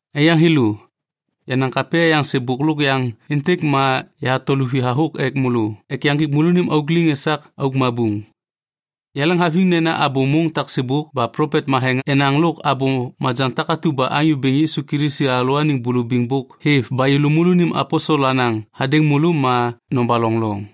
Aiyaŋ thêlô, yenaŋ kapya yaŋ sêbôk lôk yaŋ êntêk ma yahato luvi hathôk ek môlô ek yaŋgik môlônim auk liŋ esak auk mabuŋ. Yaleŋhaviŋ nena abô môŋ taksêbôk ba plopet matheŋ enaŋ lôk abô majaŋ takatu ba Anyô Bêŋ Yisu Kilisi alalôaniŋ bulubiŋ bôk hêv ba yêlô môlônim aposel anaŋ hadêŋ môlô ma nobaloŋ loŋ.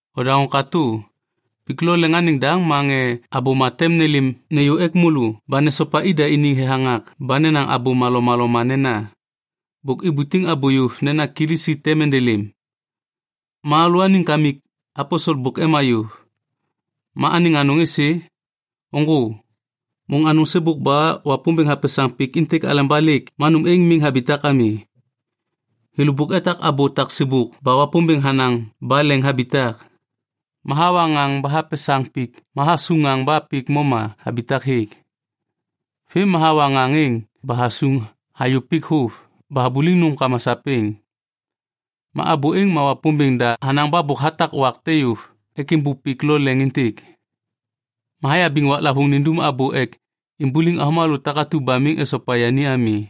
Odaŋô katô. Pik lo leŋ anêŋ daŋ ma ŋê abôma tem nêlêm nêyô ek môlô ba nesopa ida iniŋ thethaŋak ba nenaŋ abôma lomaloma nena, “Bôk ibutiŋ abô yôv nena Kilisi tem endelêm. Ma alalôaniŋ kamik aposel bôk ema yôv. Ma anêŋ anôŋ êsê? Ôŋgô. Môŋ anôŋ sêbôk ba Wapômbêŋ hapesaŋ pik êntêk aleba lêk ma nôm êŋ miŋ habitak ami.” Thêlô bôk etak abô taksêbôk ba Wapômbêŋ hanaŋ ba leŋ habitak. Ma hawa ŋaŋ ba hapesaŋ pik ma hasuŋ ŋaŋ ba pik moma habitak hêk. Vêm ma hawa ŋaŋ êŋ ba hasuŋ hayô pik vôv ba habuliŋ nômkama sapêŋ. Ma abô êŋ ma Wapômbêŋ da hanaŋ ba bôk hatak wak te yôv ek êmbôk pik lo leŋ êntêk. Ma hayabiŋ waklavôŋ nindum abô ek imbuliŋ avômalô takatu ba miŋ esopa yani ami.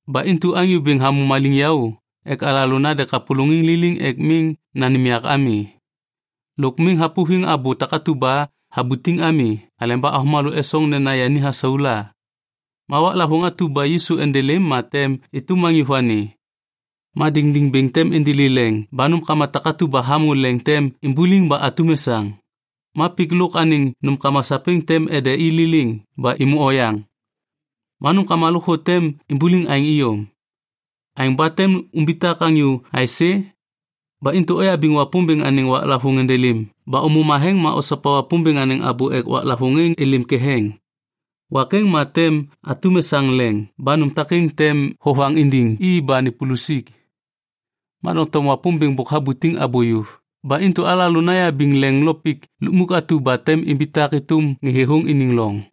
Ba intu Anyô Bêŋ hamô maliŋyaô ek alalô nande kapôlôŋiŋ liliŋ ek miŋ nanêm yak ami. Lôk miŋ hapôviŋ abô takatu ba habutiŋ ami haleba avômalô esoŋ nena yani hasau la. Ma waklavôŋ atu ba Yisu endelêm ma tem êtôm anyô vani. Ma diŋdiŋ bêŋ tem indili leŋ ba nômkama takatu ba hamô leŋ tem imbuliŋ ba atum esaŋ. Ma pik lôk anêŋ nômkama sapêŋ tem ende liliŋ ba êmô oyaŋ. Ma nômkama lôkthô tem imbuliŋ aêŋ iyom. Aêŋ ba tem umbitak anyô aisê? Ba intu oyabiŋ Wapômbêŋ anêŋ waklavôŋ endelêm ba ômô matheŋ ma osopa Wapômbêŋ anêŋ abô ek waklavôŋ êŋ êlêm ketheŋ. Wak êŋ ma tem atum esaŋ leŋ ba nôm takêŋ tem vovaŋ indiŋ i ba nipulusik. Ma doŋtom Wapômbêŋ bôk habutiŋ abô yôv ba intu alalô nayabiŋ leŋ lo pik lukmuk atu ba tem imbitak êtôm ŋê thêthôŋ iniŋ loŋ.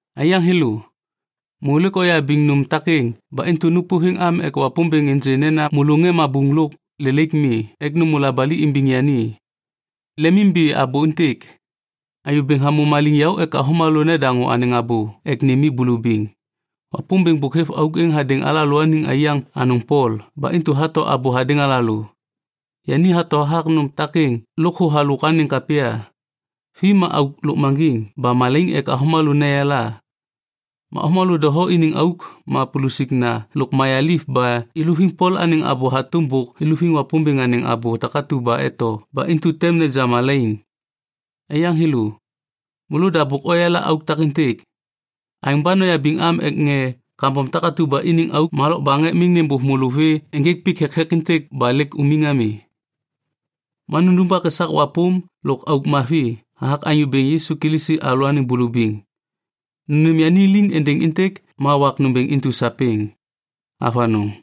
Aiyaŋ thêlô, môlô lêk oyabiŋ nôm takêŋ ba intu nôpôviŋ am ek Wapômbêŋ ênjê nena môlô ŋê mabuŋ lôk lelaik mi ek nômô labali imbiŋ yani. Lemimbi abô êntêk. Anyô Bêŋ hamô maliŋyaô ek avômalô nedaŋô anêŋ abô ek nêm i bulubiŋ. Wapômbêŋ bôk hêv auk êŋ hadêŋ alalôaniŋ aiyaŋ anôŋ Pol ba intu hato abô hadêŋ alalô. Yani hato hathak nôm takêŋ lôkthô halôk anêŋ kapya. Vi ma auk lôkmaŋgiŋ ba malaiŋ ek avômalô neyala. Ma avômalô doho iniŋ auk ma pulusikna lôk mayaliv ba iluviŋ Pol anêŋ abô hatôm bôk iluviŋ Wapômbêŋ anêŋ abô takatu ba eto ba intu tem neja malaiŋ. Aiyaŋ thêlô, môlôda bôk oyala auk takêntêk. Aêŋ ba noyabiŋ am ek ŋê kambom takatu ba iniŋ auk ma lokbaŋ ek miŋ nêbôv môlô vê ênjêk pik thekthek êntêk ba lêk umiŋ ami. Ma nundumbak esak wapôm lôk auk mavi hathak Anyô Bêŋ Yisu Kilisi alalôaniŋ bulubiŋ. Nanêm yani liŋ êndêŋ êntêk ma wak nômbêŋ intu sapêŋ. Avanôŋ.